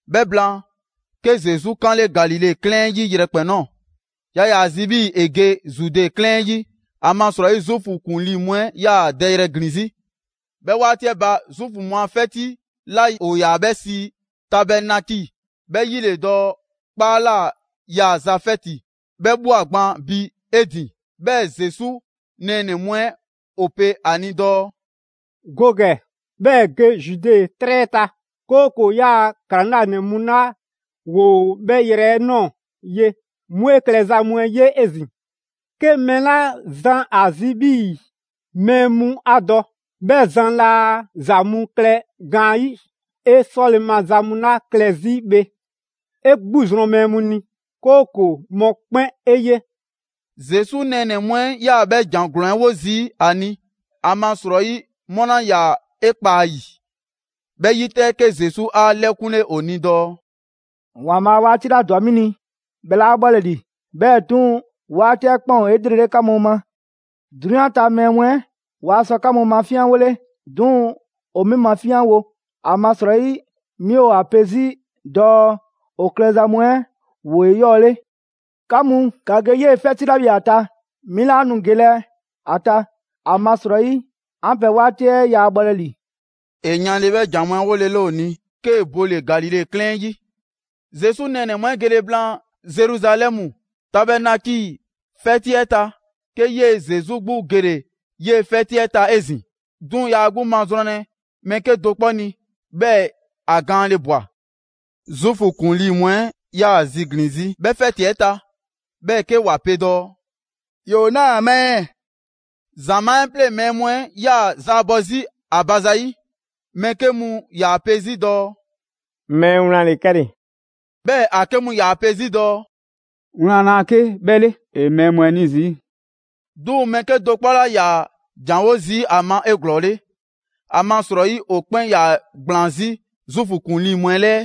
'Bhɛ blaan, 'ke Zesu 'kaanle Galile 'klɛɛn 'ɛ 'yi yrɛkpɛn‑ ꞊nɔɔ. Yaa ‑yaa ‑a zi 'bhii‑ ‑e ge Zude 'klɛɛn 'ɛ 'yi, ‑amasrɔyi Zuufu ‑kuŋlii mu 'ɛ 'yaa‑ dɛyrɛ ‑glin 'zi. 'Bhɛ 'waati 'ɛ ba, Zuufu mu a 'fɛti 'la ‑o ‑yaa 'bhɛ sii Tabɛɛnaki ('bhɛ 'yi ‑le dɔɔ 'kpaa ꞊la 'yaaza‑ 'fɛti) 'bhɛ ꞊bhwa gban bi 'e ‑din, 'Bhɛɛ‑ Zesu nɛɛnɛ‑ mu 'ɛ ‑o pe ‑a ni dɔɔ: «Go ‑gɛ, 'bhɛɛ‑ ge Zude 'trɛ ta, 'kooko‑ 'yaa‑ ‑klaŋlanɛ mu 'la ‑woo 'bhɛ yrɛ 'ɛ ꞊nɔɔ ye, 'mu 'e klɛza mu 'ɛ ye 'ezin‑. 'Ke mɛɛ 'la zan ‑a zi 'bhii‑ mɛɛ mu 'a dɔ, 'bhɛ zan laa ‑za mu klɛ gaanyi'. 'E 'sɔle‑ maza mu 'la klɛ 'zi bhe, 'e 'gbu zrɔn mɛɛ mu ni, 'kooko‑ mɔkpɛn' 'e ye.» Zesu nɛɛnɛ‑ mu 'ɛ 'yaa‑ 'bhɛ ‑jan ‑glɔɔn 'ɛ 'wo zii' ‑a ni, amasrɔyi 'mu 'laa ‑yaa 'e kpa a ‑yi. 'Bhɛ 'yi 'tɛ, 'ke Zesu 'a ‑lɛkunle ‑o ni dɔɔ: «‑Waanbhaa' 'waati 'la ‑dwa 'mi ni, 'bhɛ 'laa bhɔlɛ ‑li; 'bhɛɛ‑ 'duŋ‑ 'waati 'ɛ 'kpɛn ‑o 'elrele 'ka mu ma. 'Drunyan ta mɛɛ mu 'ɛ waa sɔ 'ka mu mafinyanwole, 'duŋ‑ ‑o 'mi mafinyanwo, ‑amasrɔyi 'mi ‑o ‑a pe 'zi dɔɔ ‑o klɛza mu 'ɛ ‑woo 'eyɔɔle. 'Ka mu, ‑ka ge 'yee‑ 'fɛti 'la bhe ‑a ta. 'Mi 'laa nu gelɛ ‑a ta, ‑amasrɔyi 'an pɛ 'waati 'ɛ yaa bhɔlɛ ‑li.» ‑E yanle 'bhɛ ‑jan mu 'ɛ 'wolele ‑o ni, 'kee‑ bole‑ Galile 'klɛɛn 'ɛ 'yi. Zesu nɛɛnɛ‑ mu 'ɛ gele blaan Zeruzalɛmu Tabɛɛnaki 'fɛti 'ɛ ta, 'ke 'yee‑ Zesu 'gbu gele 'yee‑ 'fɛti 'ɛ ta 'ezin‑. 'Duŋ‑ yaa 'gbu mazrɔnlɛ mɛɛ 'kedo‑ 'kpɔ ni, 'bhɛɛ‑ ‑a gaanle ꞊bwa. Zuufu ‑kuŋlii mu 'ɛ 'yaa‑ ‑a ziglin‑ 'zi 'bhɛ 'fɛti 'ɛ ta, 'bhɛɛ‑ 'ke ‑wa pe dɔɔ: «‑Yoo 'naa‑ ma ɛɛ?» ‑Zamaa' 'ɛ 'pleŋ‑ mɛɛ mu 'ɛ 'yaa‑ zaabɔ 'zi ‑a ba zayi'. Mɛɛ 'ke mu ‑yaa pe 'zi dɔɔ: «Mɛɛ wlan ‑le 'kɛle‑.» 'Bhɛɛ‑ ‑a 'ke mu ‑yaa pe 'zi dɔɔ: «Wlan laa 'ke 'bhɛ 'le, ‑e mɛɛ mu 'ɛ 'ni zii'.» 'Duŋ‑ mɛɛ 'kedo‑ 'kpɔ 'laa ‑yaa ‑janwo' zii' ‑a ma 'eglɔɔle, ‑amasrɔyi ‑o 'kpɛn 'yaa‑ ‑gblaan 'zi Zuufu ‑kuŋlii mu 'ɛ 'lɛɛ.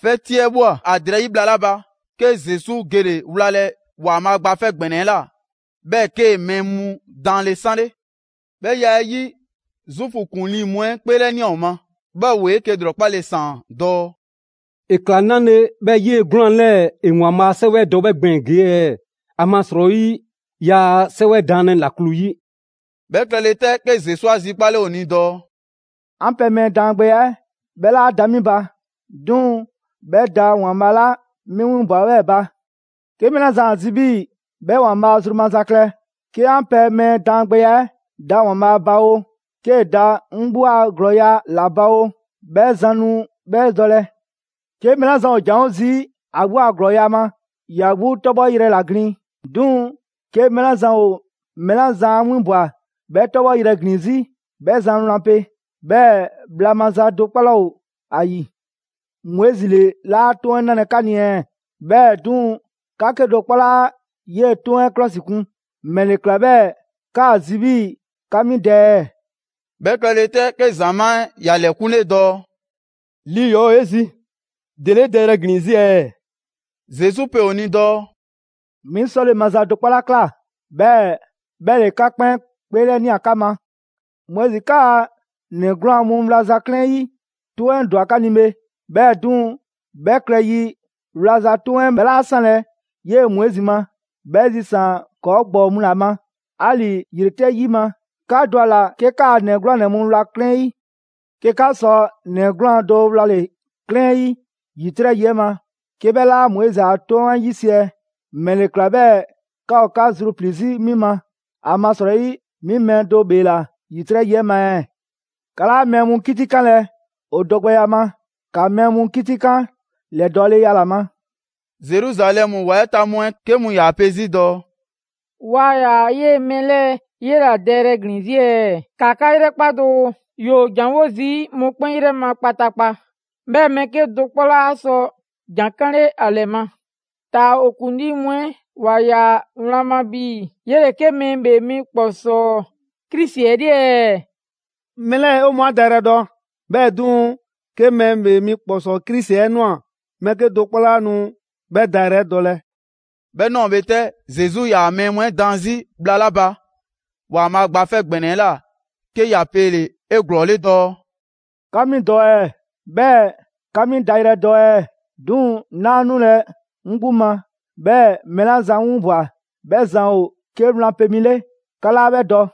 'Fɛti 'ɛ ꞊bhwa ‑a drɛyi' bhla 'la ba, 'ke Zesu gele‑ wlalɛ ‑Waanbhaa' Gba 'Fɛ ‑Gbɛnɛ 'ɛ ꞊la, 'bhɛɛ‑ 'kee‑ mɛɛ mu daanle 'sanle. 'Bhɛ ya 'ɛ 'yi, Zuufu ‑kuŋlii mu 'ɛ 'kpeelɛnia ‑o ma, 'bhɛɛ‑ ‑woo 'eke‑ ‑lrɔkpale ‑saan dɔɔ: «‑E ꞊kla 'nale‑ 'bhɛɛ‑ 'yee‑ 'gwlaan‑ 'lɛɛ‑ ‑e ‑Waanbhaa' a 'Sɛwɛ 'ɛ dɔ 'bhɛ gbɛɛn‑ ‑gee' ɛɛ, ‑amasrɔyi yaa 'sɛwɛ daanlɛ ‑laklu 'yi?» 'Bhɛ klɛle 'tɛ, 'ke Zesu 'a 'zikpale ‑o ni dɔɔ: «'An pɛ mɛɛ daangbɛya 'ɛ 'bhɛ 'laa da 'mi ba, 'duŋ‑ 'bhɛ da ‑Waanbhaa' 'la 'mi 'winbwa‑ 'bhɛɛ‑ ba. 'Ke mɛɛ 'la zan ‑a zi 'bhii‑ 'bhɛ ‑Waanbhaa' zru maza klɛ, 'ke 'an pɛ mɛɛ daangbɛya 'ɛ da ‑Waanbhaa' ba oo, 'kee‑ da 'ŋ 'gbu a ‑glɔɔya' ‑la ba oo, 'bhɛ zan nu 'bhɛ dɔlɛ. 'Ke mɛɛ 'la zan ‑o ‑janwo' zii' ‑a 'gbu a ‑glɔɔya' ma, ‑ya 'gbu 'tɔbhɔyrɛ ‑la glin. 'Duŋ‑ 'ke mɛɛ 'la zan ‑o mɛɛ 'la zan 'a 'winbwa‑ 'bhɛ 'tɔbhɔyrɛ ‑glin 'zi, 'bhɛ zan wlan pe, 'bhɛɛ‑ bhla maza do 'kpɔ 'laa ‑o ‑a ‑yi. Moizi ‑le 'laa 'Toŋ 'ɛ 'nalɛ‑ 'ka ni ɛɛ? 'Bhɛɛ‑, 'duŋ‑ 'ka 'kedo‑ 'kpɔ 'laa 'yee‑ 'Toŋ 'ɛ 'klɔsikun. ‑Mɛle ‑kla 'bhɛɛ‑ 'kaa‑ zi 'bhii‑ 'ka 'mi dɛ ɛɛ?» 'Bhɛ klɛle 'tɛ, 'ke ‑zamaa' 'ɛ ‑ya ‑lɛkunle dɔɔ: «Lii ‑yɔɔ' ‑o 'e zi! ‑Dele 'e dɛyrɛ ‑glin 'zi ɛɛ?» Zesu pe ‑o ni dɔɔ: «'Mi 'sɔle‑ maza do 'kpɔ 'la ‑kla, 'bhɛɛ‑ 'bhɛ ‑le 'ka 'kpɛn 'kpeelɛnia 'ka ma! Moizi 'kaa ‑nɛ 'gwlaan‑ mu wlaza 'klɛɛn 'yi 'toŋ 'ɛ ‑dwa 'ka ni bhe, 'bhɛɛ‑ 'duŋ‑ 'bhɛ 'klɛɛn 'yi 'wlaza‑ 'toŋ 'ɛ 'bhɛ 'laa 'sanlɛ‑ 'yee‑ Moizi ma, 'bhɛ zisaan‑ ‑kɔɔ' ‑gbɔɔ mu ‑la ma. 'Ali‑ ‑yitrɛ' yi ma, 'ka dɔ ‑a ‑la 'ke 'kaa ‑nɛ 'gwlaanɛ‑ mu wla 'klɛɛn 'yi. 'Ke 'ka sɔ ‑nɛ 'gwlaan‑ do wlale‑ 'klɛɛn 'yi ‑yitrɛ' yi 'ɛ ma, 'ke 'bhɛ 'laa Moizi a 'Toŋ 'ɛ 'yisiɛ‑, ‑mɛle ‑kla 'bhɛɛ‑ 'ka ‑o 'ka zruplii‑ 'zi 'mi ma, ‑amasrɔyi 'mi mɛɛ do ‑bheela ‑yitrɛ' yi 'ɛ ma ɛɛ? 'Ka 'laa mɛɛ mu 'kitikanlɛ ‑o dɔgbɛya ma, ‑ka mɛɛ mu 'kitikan ‑lɛdɔɔleya ‑la ma.» Zeruzalɛmu ‑wa 'ɛ ta mu 'ɛ 'ke mu ‑yaa pe 'zi dɔɔ: «Waa ‑yaa 'yee‑ mɛɛ 'lɛɛ‑ 'yela‑ dɛyrɛ glin 'zi ɛɛ? ‑Ka 'ka 'yrɛkpa doo, ‑yoo ‑janwo' zii' mɔkpɛn' 'yrɛ ma kpataakpa, 'bhɛɛ‑ mɛɛ 'kedo‑ 'kpɔ 'laa sɔ ‑jan 'kanle ‑a ‑lɛ ma! Taa‑ 'o ‑kuŋlii mu 'ɛ ‑wa ꞊ya wlan ma 'bhii‑ 'yele‑ 'ke Mɛɛ ‑Bhee Mi ‑Kpɔsɔɔ Krisi 'ɛ 'le ɛɛ? Mɛɛ 'lɛɛ‑, 'o mɔɔ 'a dayrɛ dɔ; 'bhɛɛ‑ 'duŋ‑, 'ke Mɛɛ ‑Bhee Mi ‑Kpɔsɔɔ Krisi 'ɛ ꞊nwa, mɛɛ 'kedo‑ 'kpɔ 'laa nu 'bhɛ dayrɛ 'ɛ dɔlɛ.» 'Bhɛ ꞊nɔɔ bhe 'tɛ, Zesu 'yaa‑ mɛɛ mu 'ɛ daan 'zi bhla 'la ba ‑Waanbhaa' Gba 'Fɛ ‑Gbɛnɛ 'ɛ ꞊la, 'ke ‑ya pele‑ 'eglɔɔle dɔɔ: «'Ka 'mi dɔ ɛɛ? 'Bhɛɛ‑ 'ka 'mi dayrɛ 'ɛ dɔ ɛɛ? 'Duŋ‑ 'naa 'nulɛ‑ 'ŋ 'gbu ma, 'bhɛɛ‑ mɛɛ 'la zan 'ŋ 'winbwa‑ 'bhɛ zan ‑o 'ke wlan pe mi 'le. 'Ka 'laa 'bhɛ dɔ.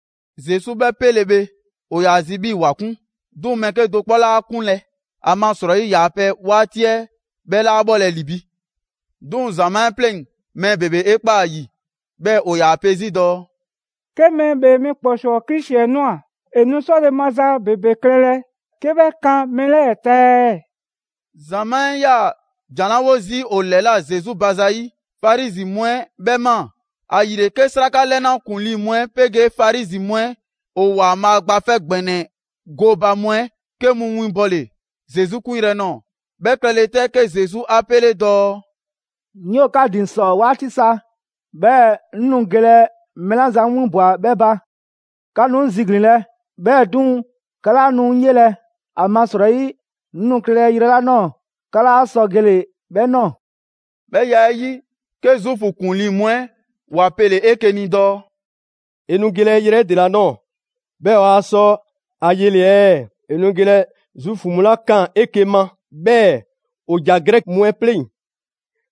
Zesu 'bhɛ 'pele‑ bhe, ‑o ‑yaa ‑a zi 'bhii‑ ‑wa 'kun. 'Duŋ‑ mɛɛ 'kedo‑ 'kpɔ 'laa 'a 'kunlɛ‑, ‑amasrɔyi ‑yaa pɛ 'waati 'ɛ 'bhɛ 'laa bhɔlɛ ‑li bi. 'Duŋ‑ ‑zamaa' 'ɛ 'pleŋ‑ mɛɛ ‑bebe 'e ‑kpaa ‑a ‑yi, 'bhɛɛ‑ ‑o ‑yaa pe 'zi dɔɔ: «'Ke Mɛɛ ‑Bhee Mi ‑Kpɔsɔɔ Krisi 'ɛ ꞊nwa, ‑e nu 'sɔle‑ maza ‑bebe klɛlɛ 'ke 'bhɛ kan mɛɛ 'lɛɛ‑ ta ɛɛ?» ‑Zamaa' 'ɛ 'yaa‑ ‑jan 'la 'wo zii' ‑o ‑lɛla' Zesu ba zayi', Farizi mu 'ɛ 'bhɛ ꞊maa. ‑Ayile 'ke 'sraka 'lɛna ‑kuŋlii' mu 'ɛ 'pegee Farizi mu 'ɛ ‑o ‑Waanbhaa' Gba 'Fɛ ‑Gbɛnɛ 'ɛ gooba mu 'ɛ 'ke mu winbɔle Zesu 'kunyrɛ‑ nɔɔ‑. 'Bhɛ klɛle 'tɛ, 'ke Zesu 'a 'pele dɔɔ: «'Ŋ 'yoo‑ 'ka ‑din ‑sɔ 'waati sa, 'bhɛɛ‑ 'ŋ nu gelɛ mɛɛ 'la zan 'ŋ 'winbwa‑ 'bhɛ ba. 'Ka nu 'ŋ ziglinlɛ, 'bhɛɛ‑ 'duŋ‑ 'ka 'laa nu 'ŋ 'yelɛ‑; ‑amasrɔyi 'ŋ nu klɛlɛ yrɛ 'la ꞊nɔɔ 'ka 'laa sɔ gele‑ 'bhɛ ꞊nɔɔ.» 'Bhɛ ya 'ɛ 'yi, 'ke Zuufu ‑kuŋlii mu 'ɛ ‑wa pele‑ 'eke‑ ni dɔɔ: «‑E nu gelɛ yrɛ 'ɛ ‑dela nɔɔ‑ 'bhɛɛ‑ 'waa sɔ ‑a yele‑ ɛɛ? ‑E nu gelɛ Zuufu mu 'la 'kaan‑ 'eke‑ ma, 'bhɛɛ‑ ‑o ‑ja Grɛki mu 'ɛ 'pleŋ‑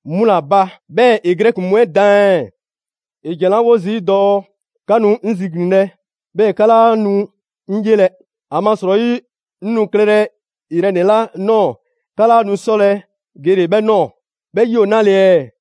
'mu ‑la ba, 'bhɛɛ‑ ‑e Grɛki mu 'ɛ daan ɛɛ? ‑E ‑jan 'la 'wo zii' dɔɔ: ‹'Ka nu 'ŋ ziglinlɛ, 'bhɛɛ‑ 'ka 'laa nu 'ŋ 'yelɛ‑; ‑amasrɔyi 'ŋ nu klɛlɛ yrɛ ‑nɛ 'la ꞊nɔɔ 'ka 'laa nu 'sɔlɛ‑ gele‑ 'bhɛ ꞊nɔɔ.› 'Bhɛ 'yi ‑o 'nale‑ ɛɛ?»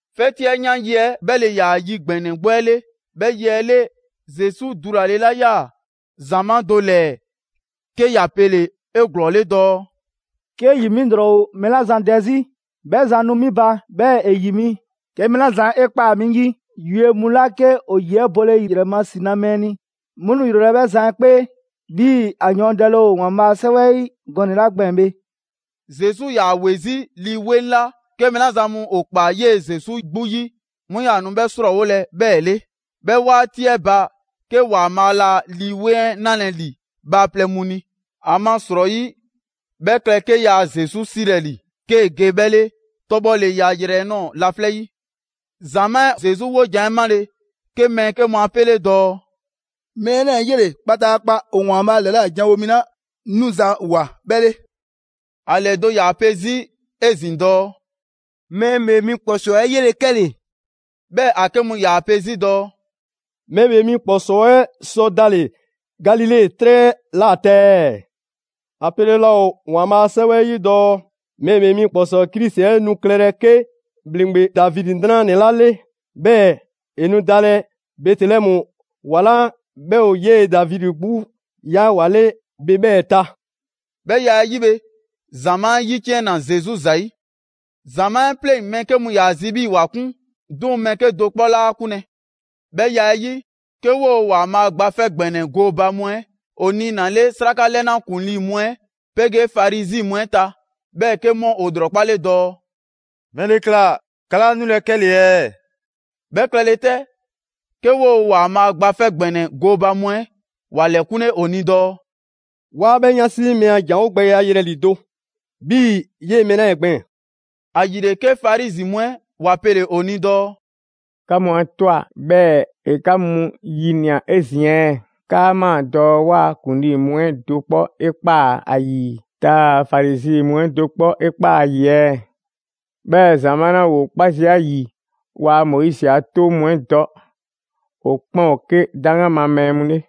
'Fɛti 'ɛ 'yan yi 'ɛ 'bhɛ ‑le ‑yaa yi ‑gbɛnɛ 'gbu 'ɛ 'le. 'Bhɛ ‑yi 'ɛ 'le, Zesu dulale 'la 'yaa‑ ‑zamaa' do ‑lɛɛ 'ke ‑ya pele‑ 'eglɔɔle dɔɔ: «'Ke ‑yi 'mi ‑lrɔ ‑o mɛɛ 'la zan dɛ 'zi, 'bhɛ zan nu 'mi ba 'bhɛɛ‑ ‑e ‑yi mi. ‹'Ke mɛɛ 'la zan 'e ꞊kpaa 'mi 'yi, yue mu 'la 'ke ‑o ‑yi 'ɛ bole ‑yrɛ ma ‑si na mɛɛ ni, 'mu nu ‑yrolɛ' 'bhɛ zan 'ɛ 'kpee›. 'Bhii‑ ‑a yɔɔndɛle ‑o ‑Waanbhaa' a 'Sɛwɛ 'ɛ gɔnɛ‑ 'la gbɛɛn‑ bhe.» Zesu 'yaa‑ ‑we 'zi Lii 'Weŋ 'la 'ke mɛɛ 'la zan mu ‑o ‑kpaa 'yee‑ Zesu 'gbu 'yi 'mu 'yaa‑ nu 'bhɛ 'srɔɔwolɛ 'bhɛɛ‑ 'le. 'Bhɛ 'waati 'ɛ ba, 'ke ‑Waanbhaa' laa Lii 'Weŋ 'ɛ 'nalɛ‑ ‑li bhaaplɛŋ mu ni; ‑amasrɔyi 'bhɛ klɛ 'ke yaa Zesu 'silɛ‑ ‑li 'kee‑ ge 'bhɛ 'le 'tɔbhɔleya yrɛ 'ɛ ꞊nɔɔ laflɛ' 'yi. ‑Zamaa' 'ɛ Zesu 'wojan‑ 'ɛ 'male‑, 'ke mɛɛ 'ke mu 'a 'pele dɔɔ: «Mɛɛ 'lɛɛ‑ 'yele‑ kpataakpa ‑o ‑Waanbhaa' ‑lɛla' janwo mi 'la 'nuza‑ ꞊woa 'bhɛ 'le!» ‑A ‑lɛdo' ‑yaa pe 'zi 'ezin‑ dɔɔ: «Mɛɛ ‑Bhee Mi ‑Kpɔsɔɔ 'ɛ 'yele‑ 'kɛle‑!» 'Bhɛɛ‑ ‑a 'ke mu ‑yaa pe 'zi dɔɔ: «Mɛɛ ‑Bhee Mi ‑Kpɔsɔɔ 'ɛ sɔ dalɛ Galile 'trɛ ‑la ta ɛɛ? ‑A pele laa ‑o ‑Waanbhaa' a 'Sɛwɛ 'ɛ 'yi dɔɔ Mɛɛ ‑Bhee Mi ‑Kpɔsɔɔ Krisi 'ɛ 'nu klɛlɛ 'ke ‑bhleŋgbe Davidi 'nranɛ‑ ‑la ‑le, 'bhɛɛ‑ ‑e nu dalɛ Bɛtelɛmu ‑wa 'la 'bhɛ ‑o 'yee‑ Davidi 'gbu ꞊ya ‑wa 'le bhe 'bhɛɛ‑ ta.» 'Bhɛ ya 'ɛ 'yi bhe, ‑zamaa' 'ɛ ‑yiciɛnna Zesu ‑zayi'. ‑Zamaa' 'ɛ 'pleŋ‑ mɛɛ 'ke mu ‑yaa zi 'bhii‑ ‑wa 'kun, 'duŋ‑ mɛɛ 'kedo‑ 'kpɔ 'laa 'kunlɛ‑. 'Bhɛ ya 'ɛ 'yi, 'ke 'woo‑ ‑Waanbhaa' Gba 'Fɛ ‑Gbɛnɛ 'ɛ gooba mu 'ɛ ‑o niinale 'sraka 'lɛna ‑kuŋlii mu 'ɛ 'pegee Farizi mu 'ɛ ta. 'Bhɛɛ‑ 'ke 'mu ‑o ‑lrɔkpale dɔɔ: «‑Mɛle ‑kla 'ka 'laa 'nulɛ‑ 'kɛle‑ ɛɛ?» 'Bhɛ klɛle 'tɛ, 'ke 'woo ‑Waanbhaa' Gba 'Fɛ ‑Gbɛnɛ 'ɛ gooba mu 'ɛ ‑wa ‑lɛkunle ‑o ni dɔɔ: «'Waa 'bhɛ 'yansi mɛɛ a ‑janwogbɛya yelɛ‑ ‑lido' 'bhii‑ 'yee‑ mɛɛ 'lɛɛ‑ gbɛɛn‑!» ‑Ayile 'ke Farizi mu 'ɛ ‑wa pele‑ ‑o ni dɔɔ: «'Ka mu 'a ꞊twa 'bhɛɛ‑ ‑e 'ka mu ‑yinia 'ezin‑ ɛɛ? 'Kaa ꞊maa dɔɔ 'waa ‑kuŋlii mu 'ɛ do 'kpɔ 'e ꞊kpaa ‑a ‑yi, taa‑ Farizi mu 'ɛ do 'kpɔ 'e ꞊kpaa ‑a ‑yi ɛɛ? 'Bhɛɛ‑ ‑zamaa' 'la ‑woo 'kpa zii' ‑a ‑yi, waa Moizi a 'Toŋ mu 'ɛ dɔ, ‑o 'kpɛn ‑o 'ke 'daŋgan ma mɛɛ mu 'le!»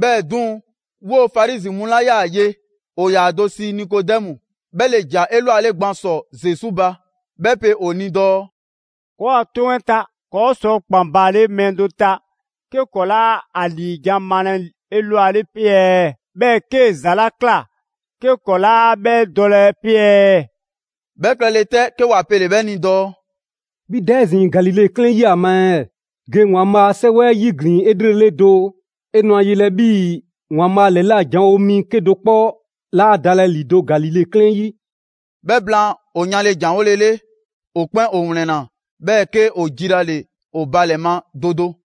'Bhɛɛ‑ 'duŋ‑, 'woo‑ Farizi mu 'la 'yaa‑ ye ‑o ‑yaa ‑o do 'sii Nikodɛmu; 'bhɛ ‑le ‑ja 'elwale gban ‑sɔ Zesu ba. 'Bhɛ pe ‑o ni dɔɔ: «‑Kɔɔa' 'toŋ 'ɛ ta, ‑kɔɔ' sɔ ‑kpan baale mɛɛ do ta, 'ke ‑kɔɔ' 'laa ‑a ‑liijan' malɛ 'elwale 'pe ɛɛ? 'Bhɛɛ‑ 'kee‑ ‑za 'la ꞊kla, 'ke ‑kɔɔ' 'laa 'bhɛ dɔlɛ 'pe ɛɛ?» 'Bhɛ klɛle 'tɛ, 'ke ‑wa pele‑ 'bhɛ ni dɔɔ: «'Bhi da 'ezin‑ Galile 'klɛɛn 'yi ‑a ma ɛɛ? Ge ‑Waanbhaa' a 'Sɛwɛ 'yiglin‑ 'elrele doo, 'e nu ‑a yelɛ 'bhii‑ ‑Waanbhaa' ‑lɛla' janwo mi 'kedo‑ 'kpɔ 'laa dalɛ ‑lido' Galile 'klɛɛn 'yi.» ['Bhɛ blaan, ‑o yanle ‑janwolele, ‑o 'kpɛn ‑o ‑wlɛnna, 'bhɛɛ‑ 'ke ‑o jilale ‑o ba ‑lɛ ma do do.